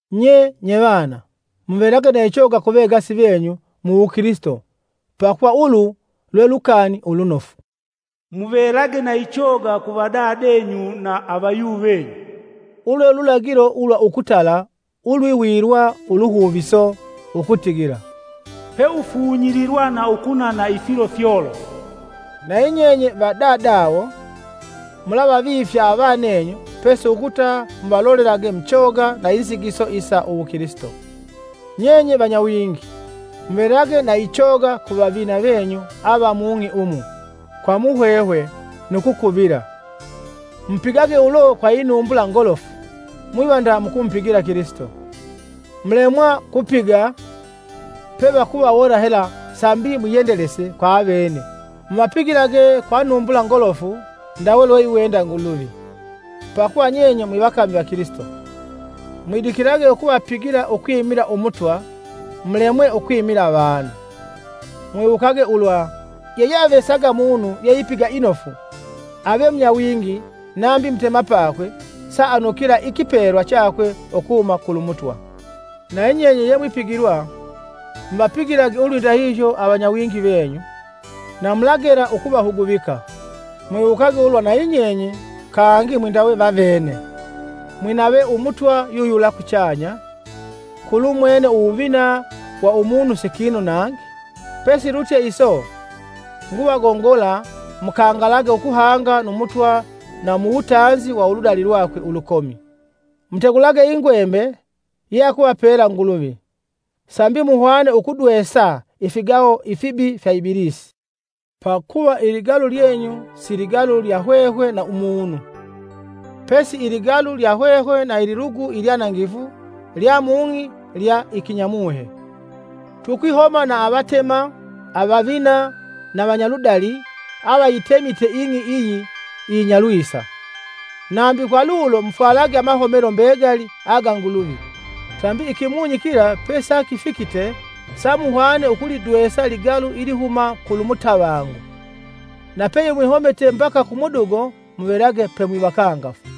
Nye, nyevana, muvelage na ichoga vegasi venyu mu wukilisito pakuva ulu lwe lukani ulunofu. “Muvelage na ichoga kuvadadenyu na avayuvenyu,” ulu lwe lulagilo ulwa ukutala ulwiwilwa uluhuviso, ukutigila, “Peufunyililwa na ukunana ifilo fyolofu.” Nayi nyenye va dadawo, mulavavifya avanenyu pesi ukuta muvalolelage muchoga na inzigiso isa uwukilisito. Nyenye vanyawingi, muvelage na ichoga vavina venyu ava mung'i umu kwa muhwehwe nu kukuvila; mupigage ulo kwa inumbula ngolofu mwiva nda mukumupigila Kilisito. Mulemwa kupiga, pevakuvawona hela sambi mwiyendelese kwa avene muvapigilage kwa numbula ngolofu ndawe lweiwenda Nguluvi, pakuva nyenye mwi vakami va Kilisito. Mwidikilage ukuvapigila ukwimila Umutwa mulemwe ukwimila avanu. Mwiwukage ulwa yeyeavesaga munu yeipiga inofu, ave munyawingi nambi mutemapakwe, saanukila ikipelwa chakwe ukuhuma kulu Mutwa. Nayi nyenye yemwipigilwa, muvapigilage ulwindahihyo avanyawingi venyu, na mulagela ukuvahuguvika. Mwiwukage ulwa na yinyenye kangi mwindawe vavene, mwinave Umutwa yuyula kuchanya, kulumwene uwuvina wa umunu si kinu nangi. Pesilutye iso, nguvagongola mukangalage ukuhanga nu Mutwa na muwutanzi wa uludali lwakwe ulukomi. Mutegulage ingwembe ye akuvapela Nguluvi sambi muhwane ukudwesa ifigaho ifibi fya Ibilisi. Pakuva iligalu lyenyu si ligalu lya hwehwe na umunu, pesi iligalu lya hwehwe na ililugu ilyanangifu lya mung'i lya ikinyamuhe; tukwihoma na avatema, avavina na vanyaludali avayitemite ing'i iyi iyinya lwisa. Nambi kwa lulo mufwalage amahomelo mbegali aga Nguluvi sambi ikimunyi kila pesakifikite samuhwane ukulidwesa ligalu ilihuma kulu mutavangu na peye mwihomite mbaka kumudugo, muvelage pemwivakangafu.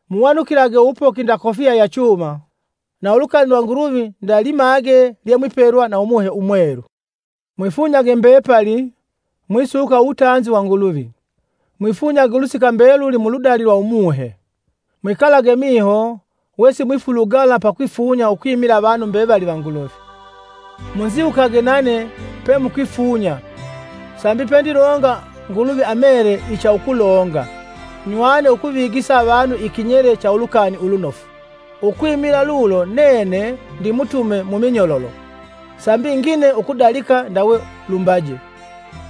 Muwanukilage uwupoki nda kofiya ya chuma, na ulukani lwa Nguluvi nda limage lye mwipelwa na Umuhe Umwelu. Mwifunyage mbepali, mwisuka uwutanzi wa Nguluvi. Mwifunyage ulusika mbeluli muludali lwa Umuhe. Mwikalage miho wesimwifulugala pakwifunya ukwimila avanu mbevali va Nguluvi. Munziwukage nane pe mukwifunya sambi pendilonga Nguluvi amele icha ukulonga, nywane ukuvigisa avanu ikinyele cha ulukani ulunofu. Ukwimila lulo nene ndimutume muminyololo sambi ngine ukudalika ndawe lumbaje.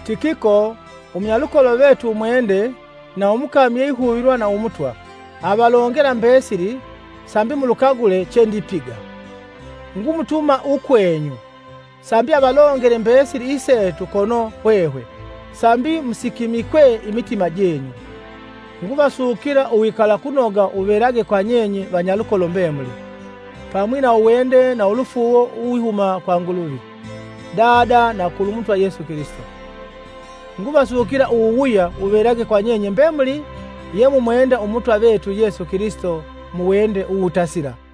Tikiko, umunyalukolo vetu umwende na umukami yeihuvilwa na Umutwa, avalongela mbesili sambi mulukagule chendipiga. Ngumutuma ukwenyu, sambi avalongele mbesili isetu kono hwehwe sambi musikimikwe imitima jenyu, Nguvasukila uwikalakunoga wuvelage kw nyenye vanyalukolo mbemuli, pamwi na uwende na ulufuuwo uwihuma kwa Nguluvi Dada na kulu Mutwa Yesu Kilisito. Nguvasukila uwuwuya wuvelage kwa nyenye mbemuli yemumwenda umutwa vetu yesu Kilisito muwende uwutasila.